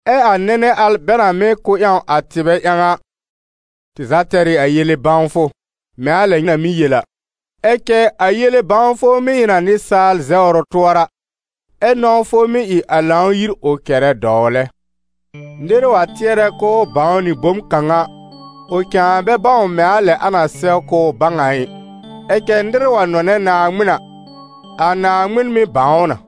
Ɛ a nɛnɛ al bɛ na mɩ́ kʋ́ ƴãw a tɩbɛ ƴãw a, «tɩ za tɛr ɩ a yele-bãwfʋ», mɛ̃ a lɛ nyɩ na mɩ́ yel a. Ɛ cɛ a yele-bãwfʋ mɩ́ ɩ n a nɩsaal zɛwr ʋ tʋɔra, ɛ nɔ̃wfʋ mɩ́ ɩ a Lãw-yir ʋ kɛrɛ dɔwlɛ. Nɩr wa tɩɛrɛ k'ʋʋ bãw nɩ bom kãw a, ʋ cãa bɛ bãw mɛ̃ a lɛ a na sɛw k'ʋʋ bãw a ɩ. Ɛ cɛ nɩr wa nɔnɛ Naaŋmɩn a, a Naaŋmɩn mɩ́ bãw ʋ na.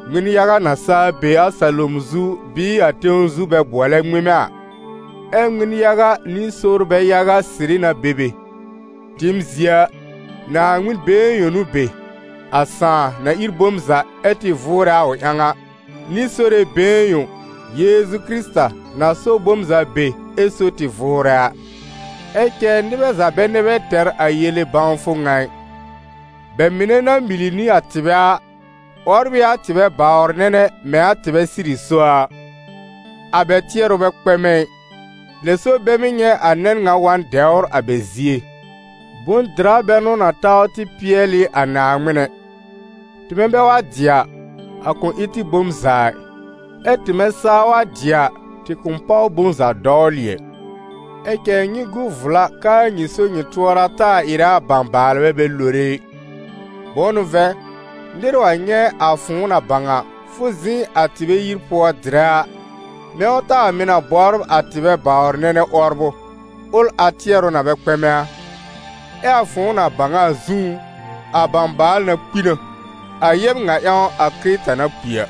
Ŋmɩn-yaga na saa be a salom zu bɩɩ a tẽw zu bɛ bʋɔlɛ ŋmɩmɛ a - ɛ ŋmɩn-yaga nɩ sorbɛ yaga sɩrɩ na be be - tɩɩm zie a, Naaŋmɩn been yõ n'ʋ be, a Sãà na ír bom za ɛ tɩ vʋʋrɛ a ʋ ƴãw a, nɩ Sore been yõ, Yeezu Kɩrɩta, na so bom za be ɛ so tɩ vʋʋrɛ a. Ɛ cɛ nɩbɛ za bɛ nɛ bɛ tɛr a yele-bãwfʋ ŋa ɩ. Bɛ mɩnɛ na mili nɩ a tɩbɛ a, 'wɔbr ɩ a tɩbɛ bawr-nɛnɛ mɛ̃ a tɩbɛ sɩrɩ so a a; a bɛ tɩɛrʋ bɛ kpɛmɛ ɩ, lɛ so bɛ mɩ́ nyɛ̃ a nɛn ŋa wa n dɛwr a bɛ zie. Bʋ̃-dɩra bɛ n'ʋ na taw tɩ pɩɛl ɩ a Naaŋmɩn ɛ; tɩmɛ bɛ wa dɩ a, a kʋ̃ ɩ tɩ bom za ɩ, ɛ tɩmɛ saa wa dɩ a, tɩ kʋ̃ páw bom za dɔwlɩ ɛ. Ɛ cɛ nyɩ gu vla k'aa nyɩ so-nyɩ-tʋɔra taa ɩrɛ a bãbaalbɛ bɛ lore ɩ. Bʋ̃ʋ n'ʋ vɛ̃, nɩr wa nyɛ̃ a fʋ̃ʋ na bãw a, fʋ zɩ̃ a tɩbɛ yir pʋɔ dɩrɛ a, mɛ̃ ʋ taa mɩ̀ na bɔbr a tɩbɛ bawr-nɛnɛ 'wɔbrʋ, ʋl a tɩɛrʋ na bɛ kpɛmɛ a? Ɛ a fʋ̃ʋ na bãw a zũú, a bãbaal na kpi na, a yɛb ŋa ƴãw a Kɩrɩta na kpi a.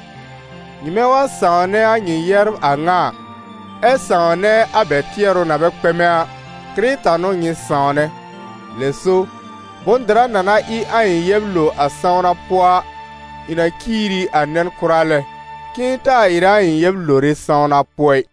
Nyɩmɛ wa sãwnɛ a nyɩ yɛbr a ŋa a, ɛ sãwnɛ a bɛ tɩɛrʋ na bɛ kpɛmɛ a, Kɩrɩta n'ʋ nyɩ sãwnɛ. Lɛ so, bʋ̃-dɩra na na ɩ a ɩ̃ yɛb lo a sãwna pʋɔ a, ɩ̃ na ciir ɩ a nɛn kʋra lɛ, k'ɩ̃ɩ taa ɩrɛ a ɩ̃ yɛb lore sãwna pʋɔ ɩ.